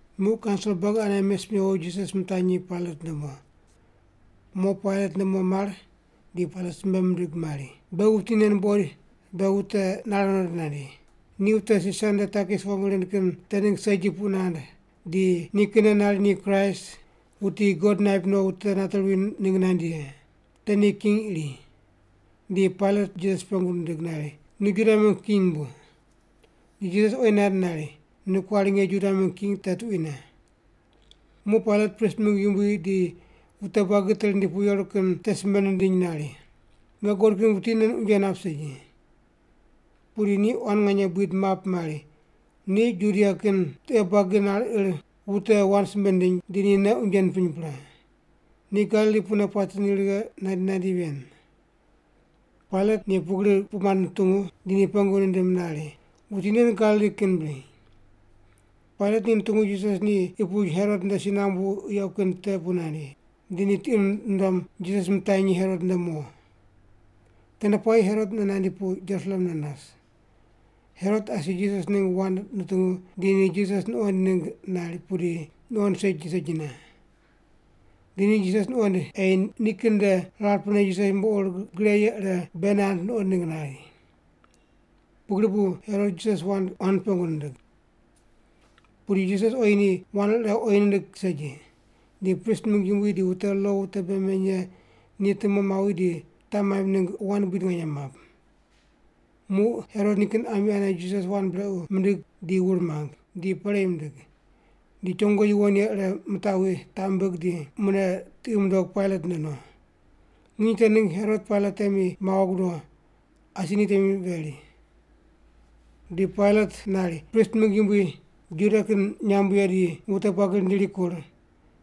Muq kaunsil buagi ane mes mewo Jisas mitanyi Pailat nde mo. Mo Pailat nde mo mar di Pailat simbe mindig mari, “Beghi wuti nen buqoid beghi wute nare nondo nandi. Ni wute Sisar nde takis wong rind kin te ningg segi puq nand, di nikinne nari ni Kraist, wuti God naip no wute nate ruwi ningg nandi ye. Te ni king iri.” Di Pailat Jisas pengu nindig nari, “Nu Juda mingg king bu?” Di Jisas oyi nand nari, “Nu kuari nge Juda mingg king te tuquine.” Muq Pailat prist mingg yumbui di wute buagi te rindi pu yeru kin te simbe nindiny nari, “Nge guqod kin wuti nen unje nap segi.” Pudi ni quan nganye buid map mari, “Ni Judia kin tiqe buagi nar ir wute wand simbe nindiny, di ni nei unje nipiny pre. Ni Galili pune puate ni righe nandi nandi ven.” Pailat ni pugri puq mand nutungu, di ni pengu nindim nari, “Wuti nen Galili kin bri?” Pailat ni nutungu Jisas ni qi puch Herot nde si nambu yequ kin te pu nandi, di ni tiqi nundom Jisas mitanyi Herot nde mo. Tende puayi Herot mune nandi pu Jerusalem ne nas. Herot asi Jisas ningg wand nutungu, di ni Jisas nuqoind ningg nari, pudi nuqoind segi segine. Di ni Jisas nuqoind ei nikin nde rar pene Jisas yumbo ur gre ye ire bei nand nuqond ningg nari. Pugri bu Herot Jisas wand quan pengu nindig. Pudi Jisas oyi ni wand ire oyi nindig segi. Di prist mingg yumbui di wute lo wute bei meny ye ni tumo mawi di taq maimb ningg wand buid nganye map. Muq Herot nikin ami ane Jisas wand brequ mindig di wur mang, di perei mindig. Di chongo yuwon ye ire mitaqwi, taq mimbig di mune tiqi mundog Pailat nde no. Nginy te ningg Herot Pailat temi mawo gudo, asi ni temi veri. Di Pailat nari prist mingg yumbui, Juda kin nyamb ye di wute buagi rindi rikur,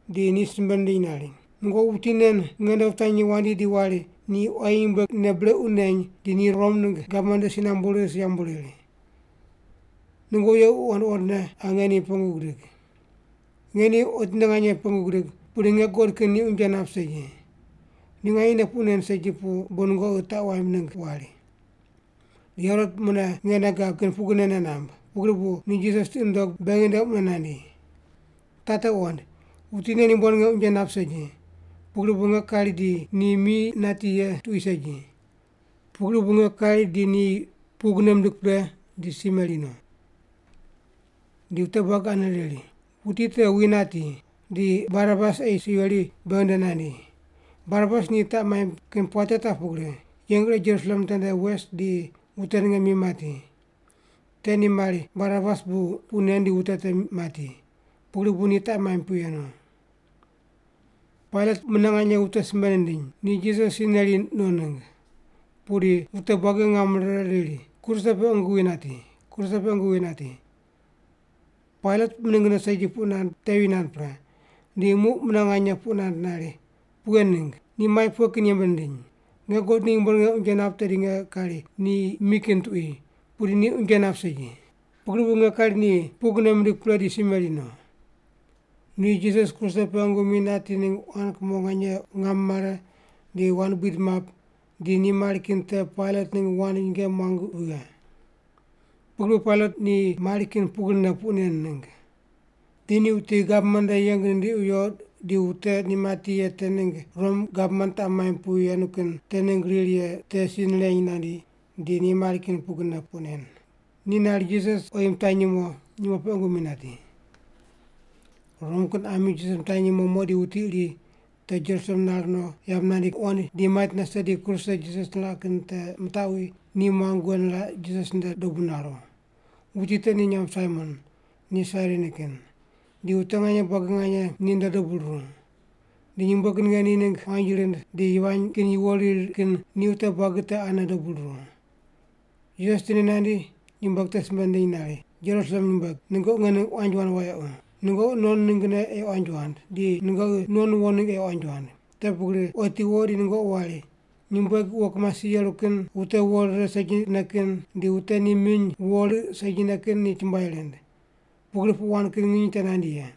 di ni simbe nindiny nari, “Nungoqi wuti nen nge nde wutanyi wandi di wari ni quayi nyumbueg nei brequ neny di ni Rom ningg gavman nde si nambu ris yambu riri. Nungoqi yequ wuqond wuqondne qa nge ni pengu gidig. Nge ni otinde nganye pengu gidig, pudi nge guqod kin ni unje nap segi. Ni nganyene puq nen segi pu bu nungoqi taq waimb ningg wari. Di Herot mune nge nei gab kin pugrine nei namb, pugri bu ni Jisas tiqi nundog beghi nde mune nandi. Taq te wuqond, wuti nen yumbo ninge unje nap segi, pugri bu nge kari di ni mi nati ye tuqui segi. Pugri bu nge kari di ni pugne mindig pre di si meri no.” Di wute buagi ane riri, “Wuti te wi nati, di Barabas ei si weri beghi nde nandi.” Barabas ni taq maimb kin puate taq pugri: yeng ire Jerusalem tende wes di wute ninge mi mati. Te ni mari Barabas bu puq nen di wute te mati, pugri bu ni taq maimb pu yenu. Pailat mune nganye wute simbe nindiny, ni Jisas si neri no ningg. Pudi wute buagi ngam rire riri, “Kruse pe qungu wi nati! Kruse pe qungu wi nati!” Pailat miningne segi puq nand tevi nand pre, di muq mune nganye puq nand nari, “Pughe ningg? Ni mai pughe kin yembe nindiny? Nge guqod ni yumbo ninge unje nap tedi nge kari ni mi kin tuqui, pudi ni unje nap segi. Pugri bu nge kari ni pugne mindig pre di si meri no.” Ni Jisas kruse pe qungu mi nati ningg quan kumo nganye ngam mare di wand buid map, di ni mari kin te Pailat ningg wand nyinge muang vighe. Pugri bu Pailat ni mari kin pugrine puq nen ningg. Di ni wuti gavman nde yeng nindiqi wiyo di wute ni mati ye te ningg Rom gavman taq maimb pu yenu kin te ningg riri ye te si nireny nandi, di ni mari kin pugrine puq nen. Ni nari Jisas oyi mitanyi mo, nyumo pe qungu mi nati. Rom kin ami Jisas mitanyi mo mo di wuti iri te Jerusalem nar no yamb nandi muqoind di mait nase di kruse Jisas niraq kin te mitaqwi, ni muang wughe niraq Jisas nde dobu naru. Wuti te ni nyamb Saimon, ni Sairini kin. Di wute nganye buagi nganye ninde dobu ruru. Di nyumbueg ninge ni ningg quanji rind di yivany kin yuwo riri kin ni wute buagi te ane dobu ruru. Jisas tindi nandi, nyumbueg te simbe nindiny nari, “Jerusalem nyumbueg, nungoqi nge ningg quanji wand wayequ. Nungoqi non ninggne ei quanji wand, di nungoqi non wo ningg ei quanji wand. Te pugri otiwo di nungoqi wari, ‘Nyumbueg wo kimasi yeru kin, wute wo rire segine kin, di wute ni miny wo riq segine kin ni chumbuai rind.’ Pugri puq wand kin nginy te nandi ye.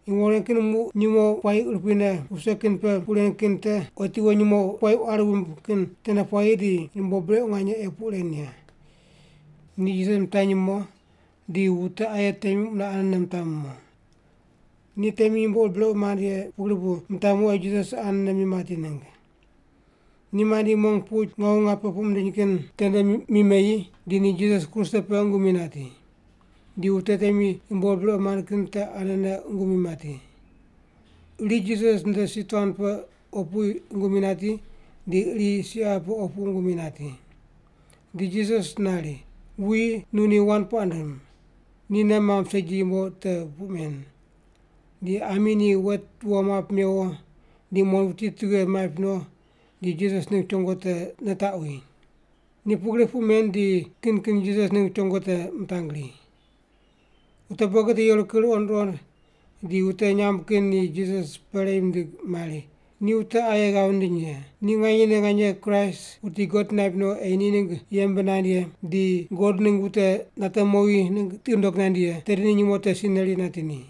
Yumbo ren kin muq nyumo puayi urupui ne wuse kin pe puq ren kin te otiwo nyumo puayi quari wumb kin tende puayi di yumbo brequ nganye ei puq ren ye.” Ni Jisas mitanyi mo di wute aye temi mune anene mitami mo. Ni temi yumbo ur brequ mand ye pugri bu mitami mo ei Jisas anene mi mati ningg. Ni mandi mong puch Ngawu Ngape puq mindiny kin tende mi meyi, di ni Jisas kruse pe qungu mi nati. Di wute temi yumbo ur brequ mand kin te ane qungu mi nati. Iri Jisas nde si tuan pe opu qungu mi mati, di iri si qaqi pe opu qungu mi nati. Di Jisas nari, “Wuyi, nu ni wand puaq ndim, ni nei mamb segi yumbo te puq men.” Di ami ni wet wo map mewo di muqond wuti tughe maip no di Jisas ningg chongo ire nitaqwi. Ni pugri puq men di kin kin Jisas ningg chongo te mitangri. Wute buagi te yeru ruqond ruqond di wute nyamb kin ni Jisas perei mindig mari, “Ni wute aye ghav nindiny ye, ni nganyene nganye Kraist, wuti God naip no ei ni ningg yembe nand ye, di God ningg wute nate mowi ningg tiqi nundog nandi ye, tedi ni nyumo te si neri nati ni.”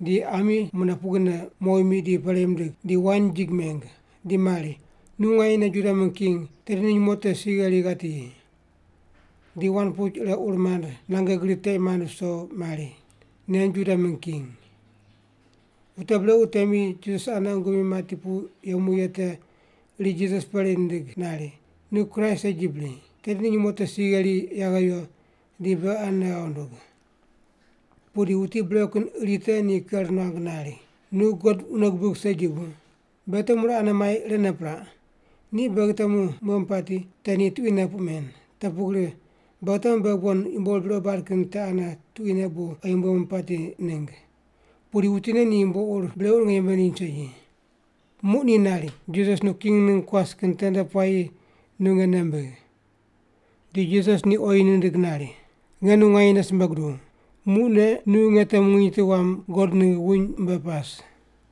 Di ami mune pugrine mowi mi di perei mindig. Di wain jig meng, di mari, “Nu nganyene Juda mingg king, tedi nu nyumo te si gheri ghati yi.” Di wand puch ire ur mand nange gri teq mand viso mari, “Nen Juda mingg king.” Wute brequ temi te Jisas ane qungu mi mati pu yemu ye te iri Jisas perei nindig nari, “Nu Kraist segi bri? Tedi nu nyumo te si gheri yaghe yo, di beghi anene ghav ndug.” Pudi wuti brequ kin iri te ni ker nuang nari, “Nu God wune gubig segi bu? Beghi temu ire ane mai irene piraq. Ni beghi temu mumbuemu pati, te ni tuquine puq men. Te pugri beghi temu beghi bon yumbo ur brequ bad kin te ane tuquine bu oyi mumbuemu pati ningg. Pudi wuti nen ni yumbo ur brequ ninge yembe nindiny segi.” Muq ni nari, “Jisas, nu king ningg kuas kin tende puayi nu nge nei mbigh.” Di Jisas ni oyi nindig nari, “Nge nu nganyene simbe guduw, muqne nu nge temu nginy tu wam God ningg wuny mbe pas.”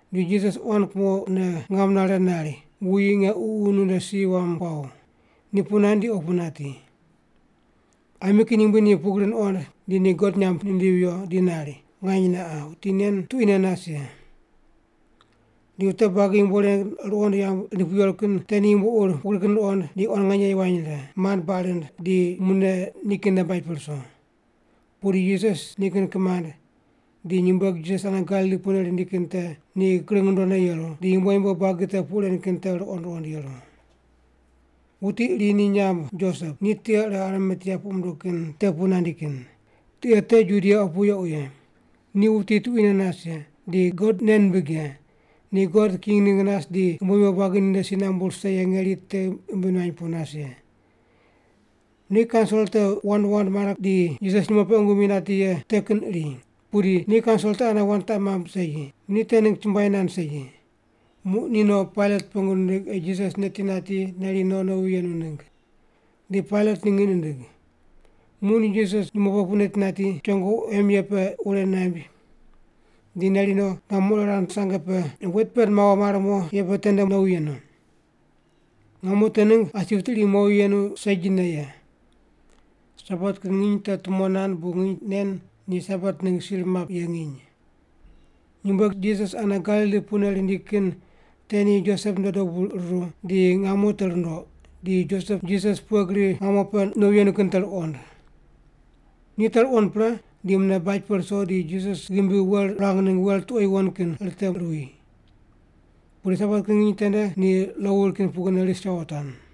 Di Jisas quan kumone ngam nare nari, “Wuyi, nge ququ nu nde si wam kuaw.” Ni puq nand di opu nati. Ami kin yumbui ni pugri nuqond, di ni God nyamb nindivi viyo, di nari, “Nganyene qa, wuti nen tuquine nas ye.” Di wute buagi yumbo ren ruqond yamb rindi pu yeru kin te ni yumbo ur pugri kin ruqond, di quan nganye yivany rire, mand baq rind, di mune nikin nde baj pe ruso. Pudi Jisas nikin kimand, di nyumbueg Jisas ane Galili pune rindi kin te ni kring rundone yeru, di yumbo yumbo buagi te puq ren kin te ruqond ruqond yeru. Wuti iri ni nyamb Josep, ni tiqe ire Arimatea puq munduw kin te pu nandi kin. Tiqe te Judia opu yequ ye. Ni wuti tuquine nas ye, di God nei nimbig ye, ni God king ningg nas di yumbo yumbo buagi ninde si nambu rise ye ngeri te ghimbi nuany pu nas ye. Ni kaunsil te wand wand mare di Jisas nyumo pe qungu mi nati ye te kin iri, pudi ni kaunsil te ane wand taq mamb segi. Ni te ningg chumbuai nand segi. Muq ni no, Pailat pengu nindig ei Jisas neti nati neri no nowi yenu ningg. Di Pailat ni ngiq nindig. Muq ni Jisas nyumo pe pu neti nati, chongo quem ye pe wureq naimb, di neri no, ngamo ire rand sange pe wet pend mawo mar mo ye pe tende nowi yenu. Ngamo te ningg asi wuti iri mowi yenu segine ye. Sabat kin nginy te tumo nand bu nginy nen ni Sabat ningg sir map ye nginy. Nyumbueg Jisas ane Galili pune rindi kin te ni Josep nde dobu ruru, di ngamo te rundoq, di Josep Jisas pughe gri ngamo pe nowi yenu kin te ruqond. Ni te ruqond pre, di mune baj pe ruso di Jisas ghimbi wel ruang ningg wel tuqo yuwon kin riteruwi. Pudi Sabat kin nginy tende ni lo wuri kin pugrine ris yawotuan.